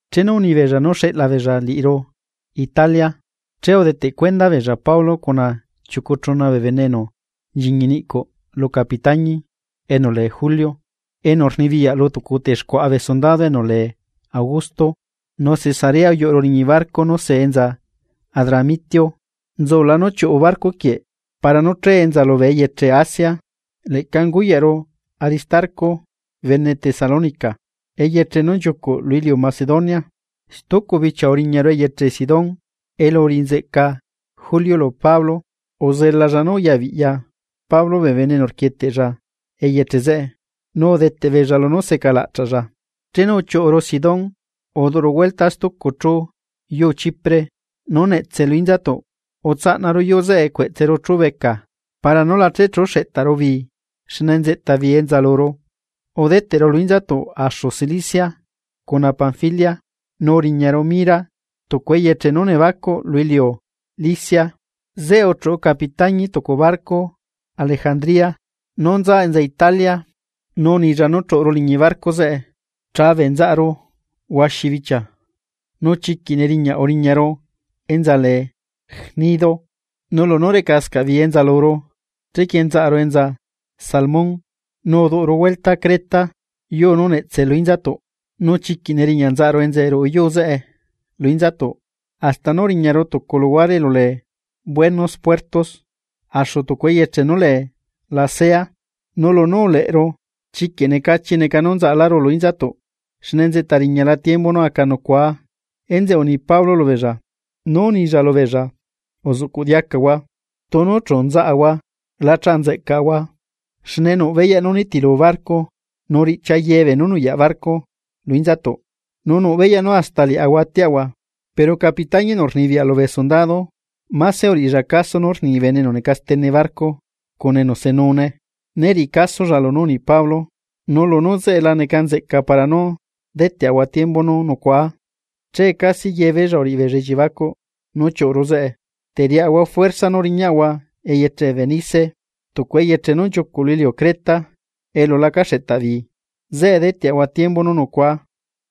Chenu unibeella nú xeꞌla beella liꞌiru Italia, che udeteꞌ cuenda beella Pablo cuna chiucu chuna bee bene enu nchiñi niꞌcuꞌ lu capitáñi enu lee Julio, enu rnibiyaꞌ lu tucu texcuaꞌa bee sundado enu lee Augusto. Nu Cesarea uyuꞌuru liñi barco nu see enza Adramitio, nzula nú chiuꞌu barco quieꞌ para nú chae enza lubee eyeche Asia. Leꞌca unguyaꞌru Aristarco, bene Tesalónica, eyeche nú nchiucuꞌ lu iliu Macedonia. Stucu bichia uriñaru eyeche Sidón, elu uriꞌi nzeꞌca Julio lu Pablo, uzelalla nú uyabiꞌya Pablo bee bene enu rquieteꞌlla eyeche zeꞌe nu udeteꞌbeella lunú seca laꞌchaꞌlla. Chenu uchiuꞌuru Sidón uduꞌuru huelta stucu chú yuu Chipre nú netse lu inzatuꞌ, utsaꞌnaru yuu zeꞌe cueꞌtseru chúbeca para nú la chechuꞌu xeꞌtaru bii xne nzeꞌta bii enza luru. Udeteꞌru lu inzatuꞌ axu Cilicia cuna Panfilia, nu uriñaru Mira, tucu eyeche nú nebacuꞌ lu iliu Licia. Zeꞌe uchuꞌu capitáñi tucu barco Alejandría nú nza enza Italia, nu unilla nú chuꞌuru liñi barco zeꞌe. Chabeꞌ nzaꞌaru huaxi bichia, nu chiquiꞌ neriñaꞌ uriñaru enza lee Gnido. Nu lunú recascaꞌ bii enza luru chequie nzaꞌru enza Salmón, nu uduꞌuru huelta Creta yuu nú netse lu inzatuꞌ. Nu chiquiꞌ neriñaꞌ nzaꞌaru enza ruꞌu yuu zeꞌe lu inzatuꞌ, hasta nú uriñaru tucu luhuare elu lee Buenos Puertos axu tucu eyeche nú lee Lasea. Nu lunú uleꞌru, chiquiꞌ necachi neca nú nzaꞌaláru lu inzatuꞌ, xne nzeꞌta riñala tiembu nú aca nucuaa. Enzeꞌe uni Pablo lubeella, nú unilla lubeella: ―Uzuꞌcuꞌ diacahua, tunu chu nzaꞌahua la chanzeꞌcaꞌahua xne nuꞌ beyaꞌ nú nitilu barco nu riꞌchia ye beenú nuyaꞌ barco lu inzatuꞌ, nu nuꞌ beyaꞌ nú hasta liaꞌahua atiaꞌahua. Pero capitañi enu rnibiyaꞌ lubee sundado, máse uriꞌilla caso nú rni bene enu neca stene barco cuna enu senune, né riꞌilla caso lunú uni Pablo. Nu lunú zeꞌe la neca nzeꞌca para nú deteꞌahua tiembu nú nucuaa, che casi yebeella uriꞌibeella elliebacuꞌ nú chiuꞌuru zeꞌe, teriaꞌahua juerza nú riñaꞌahua eyeche Fenice, eyeche nú nchiucuꞌ lu iliu Creta elu laca xeꞌtaꞌ bii, zeꞌe deteꞌahua tiembu nú nucuaa.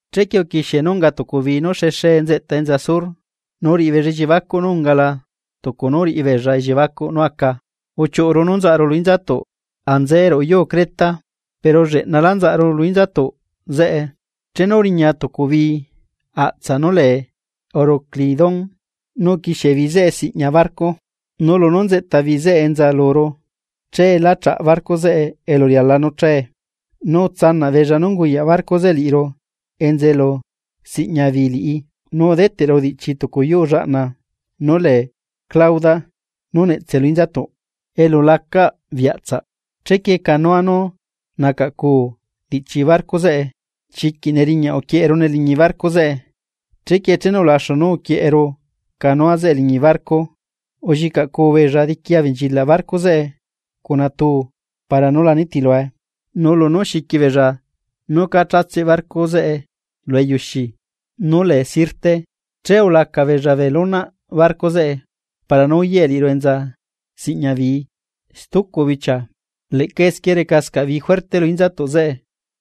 Chequie uquixie nú unga tucu bii nú xexee nzeꞌta enza sur, nu uriꞌibeella elliebacuꞌ nú ungala tucu nú uriꞌibeella elliebacuꞌ nú aca, uchiuꞌuru nú nzaꞌaru lu inzatuꞌ enza ruꞌu yuu Creta. Pero lleꞌnalá nzaꞌaru lu inzatuꞌ zeꞌe chenu uriña tucu bii aꞌtsaꞌ nú lee Euroclidón, nu uquixie bii zeꞌe siꞌña barco. Nu lunú nzeꞌta bii zeꞌe enza luru che lá chaꞌ barco zeꞌe elu riala nú chae, nu utsanaꞌ beella nú unguyaꞌ barco zeꞌe liꞌiru enza elu siꞌña bii liꞌi. Nu udeteꞌru diꞌchi tucu yuu llaꞌna nú lee Clauda nú netse lu inzatuꞌ, elu lacaꞌ bii aꞌtsaꞌ, chequie canoa nú nacaꞌcuu diꞌchi barco zeꞌe, chiquiꞌ neriñaꞌ uquieꞌerune liñi barco zeꞌe. Chequie chenu ulaxu nú uquieꞌeru canoa zeꞌe liñi barco, ullicaꞌcuu beella diqui abenchilaꞌ barco zeꞌe cuna tuu para nú la nitilue, nu lunú xiqui beella nú cá chatseꞌ barco zeꞌe lu eyuxi nú lee Sirte, che ulaca beella bee lonaꞌ barco zeꞌe para nú uyaꞌe liꞌiru enza siꞌña bii. Stucu bichia, leꞌca esquie recascaꞌ bii juerte lu inzatuꞌ zeꞌe,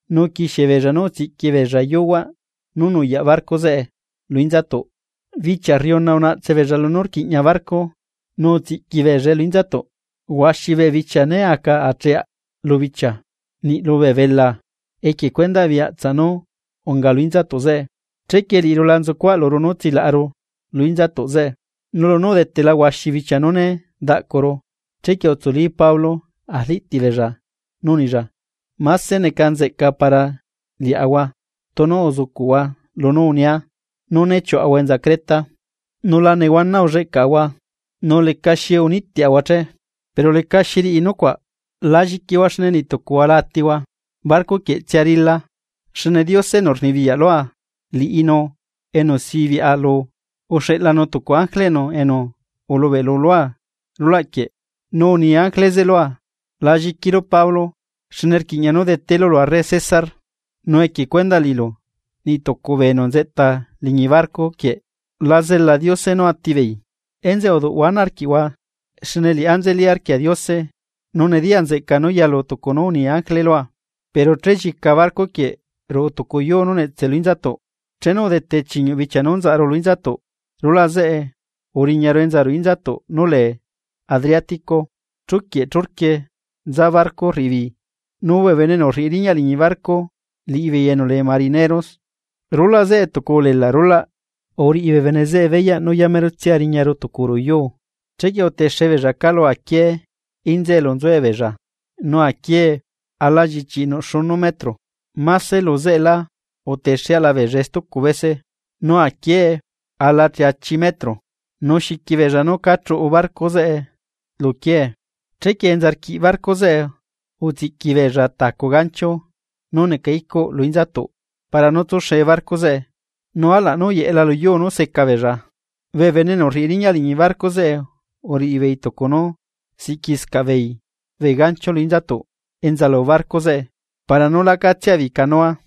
nu uquixiebeella nú utsiꞌqui beella yuhuaꞌ nú nuyaꞌ barco zeꞌe lu inzatuꞌ. Bichia rriuna unaꞌtse beella lunú rquiꞌña barco nu utsiꞌqui beellae lu inzatuꞌ. Huaxi bee bichia né aca acheaꞌ lubichia, niꞌ lubee belaa, equie cuendaꞌ bii aꞌtsaꞌ nú unga lu inzatuꞌ zeꞌe. Chequie liꞌiru la nzucuaꞌluru nú tsilaꞌalaru lu inzatuꞌ zeꞌe. Nu lunú udetela huaxi bichia nú né daꞌcuru, chequie utsuli Pablo arliꞌtiꞌ beella nu unilla: ―Máse neca nzeꞌca para liaꞌahua tunu uzucuꞌhua lunú unia nú né chiuꞌahua Creta, nu la nehuana ulleꞌcaꞌahua, nu lecaxi unitiaꞌahua che. Pero lecaxi riꞌi nucuaꞌ, la lliquihua xne niꞌtucuhua la atihua, barco quieꞌtsia rila. Xne Diose enu rnibiyaꞌ lua liꞌinu enu sibiꞌa lu uxeꞌlanu tucu ángele enu ulubeꞌlu lua rulaꞌquieꞌ. Nu uni ángele zeꞌe lua: “La lliquilu Pablo, xne rquiꞌña nú detelu lu arre César, nu equie cuendaꞌ liꞌilu niꞌ tucu bee enu nzeꞌta liñi barco quieꞌ la zela Diose nú atibeei.” Enzeꞌe uduꞌhua ana arquiꞌhua, xne liꞌá nzeli arquia Diose, nu nediya nzeꞌca nú yalu tucu nú uni ángele lua. Pero chellica barco quieꞌ ruꞌu tucu yuu nú netse lu inzatuꞌ. Chenu udete chiñuꞌ bichia nú nzaꞌaru lu inzatuꞌ, rulaꞌ zeꞌe uriñaru enza ruꞌu inzatuꞌ nú lee Adriatico, che chuquieꞌ churquie nza barco rriꞌi bii, nu bee bene enu rriꞌi riñaꞌ liñi barco liꞌibeei enu lee marineros, rulaꞌ zeꞌe tucu ulelaꞌ rulaꞌ uriꞌi bee bene zeꞌe beyaꞌ nú yamerotsia riñaru tucu ruꞌu yuu. Chequie utexe beella calu aquiee inza elu nzuebeella, nu aquiee alallichiꞌi nuꞌ xuꞌcu metro, máse lu zeꞌela utexeaꞌla beellae stucu bese, nu aquiee ala cheachi metro. Nu xiqui beella nú cá chuꞌu barco zeꞌe lu quiee, chequie enza rquiꞌ barco zeꞌe utsiꞌqui beella tacu gancho nú neca icuꞌ lu inzatuꞌ para nú tsuxe barco zeꞌe, nu alaꞌ nú uyeꞌela luyuu nú secabeella. Bee bene enu rriꞌi riñaꞌ liñi barco zeꞌe, uriꞌibeei tucu nú siꞌquiscaꞌ beei bee gancho lu inzatuꞌ enza lu barco zeꞌe para nú lacatsia beei canua,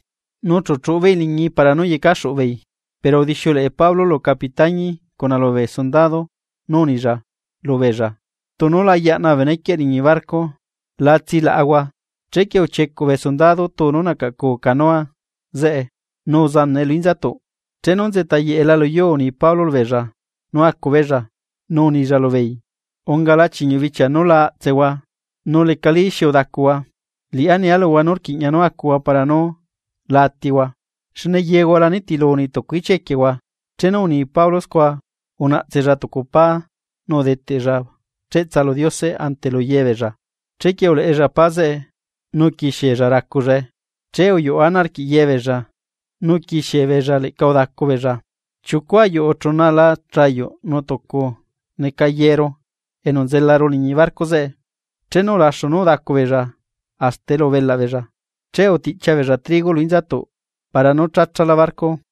nu chu chuꞌubeei liñii para nú yecaxuꞌu beei. Pero udixiuleꞌe Pablo lu capitañi cuna lubee sundado nu unilla, lubeella: ―Tunu la yaꞌna bee benequieꞌ liñi barco, la tsilaꞌahua. Chequie uchiecuꞌ bee sundado tuu nú nacaꞌcuu canoa zeꞌe nu uzanaꞌe lu inzatuꞌ. Chenu nzeꞌta yeꞌela luyuu uni Pablo lubeella nú acubeella, nu unilla lubeella: ―Ungala chiñuꞌ bichia nú la aꞌtsehua nu lecalí xi udacuhua. Liꞌá nia luhua nú rquiꞌña nú acuhua para nú la atihua. Xne yehua la niti niꞌtucu ichia equiehua. Chenu uni Pablo scua, unaꞌtsella tucu pá nu udeteꞌlla cheꞌtsa lu Diose ante lu yebeella. Chequie uleꞌella pá zeꞌe nu uquixiella racullae. Che uyuꞌu ana arquiꞌ yebeella nu uquixiebeella leꞌca udacubeella. Chiucu ayuꞌu chuna ala chayuꞌ nuꞌ tucu neca yeeru enu nzelaru liñi barco zeꞌe. Chenu ulaxu nú udacu beella hasta elu ubelaꞌ beella, che utiꞌchia beella trigo lu inzatuꞌ para nú chacha barco.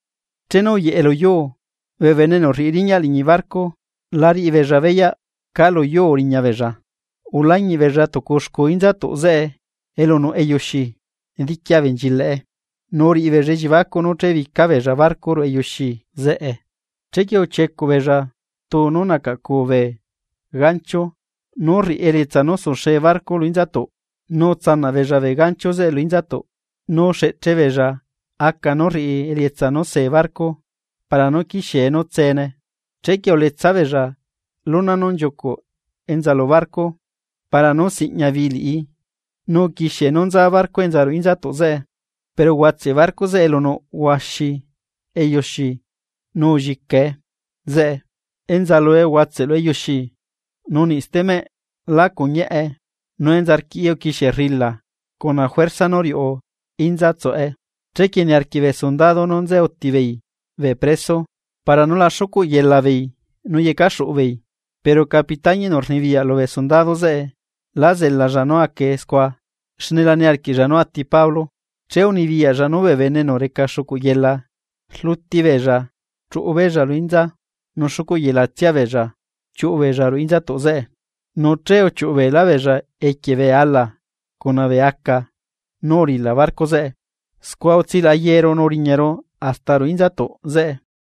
Chenu uyeꞌe luyuu, bee bene enu rriꞌi riñaꞌ liñi barco lá riꞌibeella beyaꞌ cá luyuu uriñabeella. Ulañiꞌbeella tucu xcuu inzatuꞌ zeꞌe elu nuꞌ eyuxi diqui abenchilaꞌe, nu uriꞌi beella elliebacuꞌ nú chebica beella barco ruꞌu eyuxi zeꞌe. Chequie uchiecuꞌ beella tuu nú nacaꞌcuu bee gancho nú rriꞌi elietsa nú suxee barco lu inzatuꞌ nu utsanaꞌ beella bee gancho zeꞌe lu inzatuꞌ, nu uxeꞌche beella aca nú rriꞌi elietsa nú see barco para nú quixie nú tsene. Chequie uletsa beella lona nú nchiucuꞌ enza lu barco para nú ziꞌña bii liꞌi, nu uquixie nú nza barco enza ruꞌu inzatuꞌ zeꞌe. Pero uhuatseꞌ barco zeꞌe elu nuꞌ huaxi eyuxi nu ullicae zeꞌe. Enza lue uhuatseꞌ lu eyuxi nu niꞌ stemeꞌ lá cuñiaꞌe, nu enza rquiꞌi uquixie rrila cuna juerza nú riuꞌu inza tsuꞌe. Chequie niarquiꞌ bee sundado nú nze utibeei bee preso para nú la xucuꞌ yelabeei nu yecaxuꞌu beei. Pero capitañi enu rnibiyaꞌ lubee sundado zeꞌe lá zelalla nú acae scua, xne la niarquiꞌlla nú ati Pablo, che unibiyaꞌlla nú bee bene enu reca xucuꞌyela rluti beella chuꞌubeella lu inza nu xucuꞌ yelatsia beella chiuꞌu beella ruꞌu inzatuꞌ zeꞌe. Nu che uchiuꞌu beelá beella equie bee ala cuna bee aca nú uriꞌila barco zeꞌe. Scua utsilaꞌa yeeru nu uriñaru hasta ruꞌu inzatuꞌ zeꞌe.